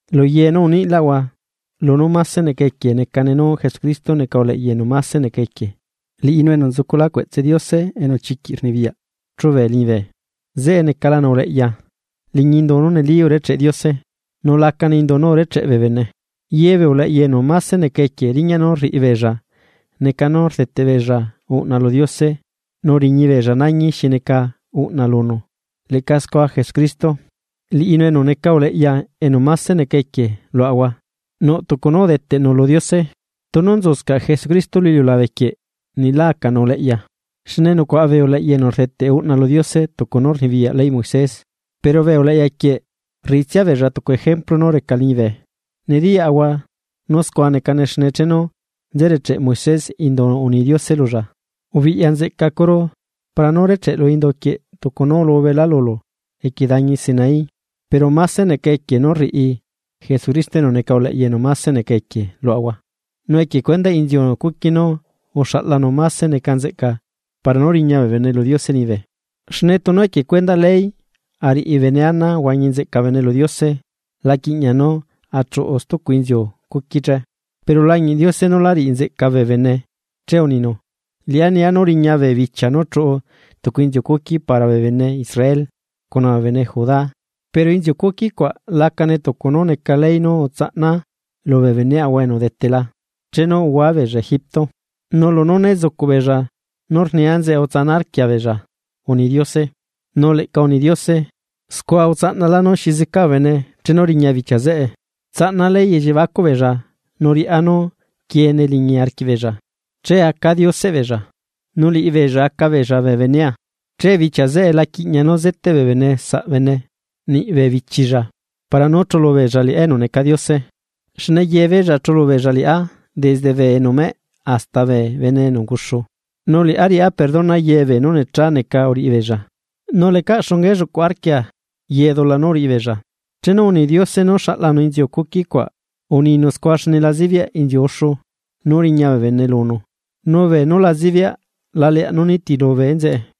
Luye nú uniꞌlaꞌahua, lunú máse neca equie necane nú Jesucristo neca uleꞌya enu máse neca equie liꞌinu enu nzucula cueꞌtse Diose enu chiquiꞌ rnibiyaꞌ chube liñibe. Zeꞌe necalanu uleꞌya, liñi indu nú neli urecheꞌ Diose, nu la necane indu nú urecheꞌ bee bene. Ye bee uleꞌya enu máse neca equie, riñaꞌ nú rriꞌibeella neca nú rdeteꞌ beella uꞌna lu Diose nu riñibeella nañi xi neca uꞌna lunu leꞌca scua Jesucristo, liꞌinu enu neca uleꞌya enu máse neca equie luaꞌahua nuꞌ tucu nú udeteꞌnu lu Diose. Tunu nzuscaꞌ Jesucristo lu iliulabe quieꞌ niꞌ lá acanu uleꞌya, xne nucuaꞌa bee uleꞌya enu rdeteꞌ uꞌna lu Diose tucu nú rnibiyaꞌ leyꞌ Moisés. Pero bee uleꞌya quieꞌ, rriꞌitsia beella tucu ejemplu nú reca liñibe. Nediyaꞌahua nú scua necane xne chenu nze recheꞌ Moisés indu uni Diose lulla: “Ubiꞌya nzeꞌcacuru para nú recheꞌlu indu quieꞌ tucu nú ulubela lulu equie dañi Sinaí.” Pero máse neca equie nú rriꞌi Jesucristo enu neca uleꞌya enu máse neca equie luaꞌahua, nu equie cuendaꞌ inziu cuqui nú uxaꞌlanu máse neca nzeꞌca para nú riña bee bene lu Diose liñibe. Xne tunu equie cuendaꞌ ley ariꞌi bene ana ahuañi nzeꞌca bene lu Diose la quiꞌñiaꞌ nú achuꞌu stucu inziu cuqui che. Pero ulañiꞌ Diose nú lá riꞌi nzeꞌca bee bene che uninu: Liꞌá nia nú riña bee bichia nú chuꞌu tucu inziu cuqui para bee bene Israel, cuna bee bene Judá. Pero inziu cuqui cuaꞌ lacane tucu nú neca ley nú utsaꞌnaa lubee beneꞌhua enu udetela, chenu uhua beella Egipto; nu lunú né zucuꞌbeella nú rnia enzeꞌe utsana arquia beella, uni Diose. Nu leꞌca uni Diose: Scua utsaꞌnalá nú xi zeca bee bene chenu riña bichia zeꞌe. Tsaꞌnaa ley elliebacuꞌ beella nu riꞌá nú quiene liñi arquiꞌbeella. Che acaa Dioseꞌbeella, nu liꞌibeella aca beella bee benea. Che bichia zeꞌe la quiꞌña nú zeteꞌ bee bene saꞌ bene. Niꞌ bee bichilla para nú chulubeella liꞌá enu neca Diose, xne yebeella chulubeella liꞌá, desde bee enu meꞌ hasta bee bene enu unguxu. Nu liꞌá riꞌá perdona ye beenu necha neca uriꞌi beella, nu lecaꞌ xunga elluꞌcuꞌ arquia ye dula nú uriꞌi beella. Chenu uni Diose nú xaꞌlanu inziu cuquicuaꞌ uninu scua xne la zibiaꞌ inziu uxu nú riña bee bene lunu nu beenú la zibiaꞌ la leaꞌ nú nitilu bee enzeꞌe.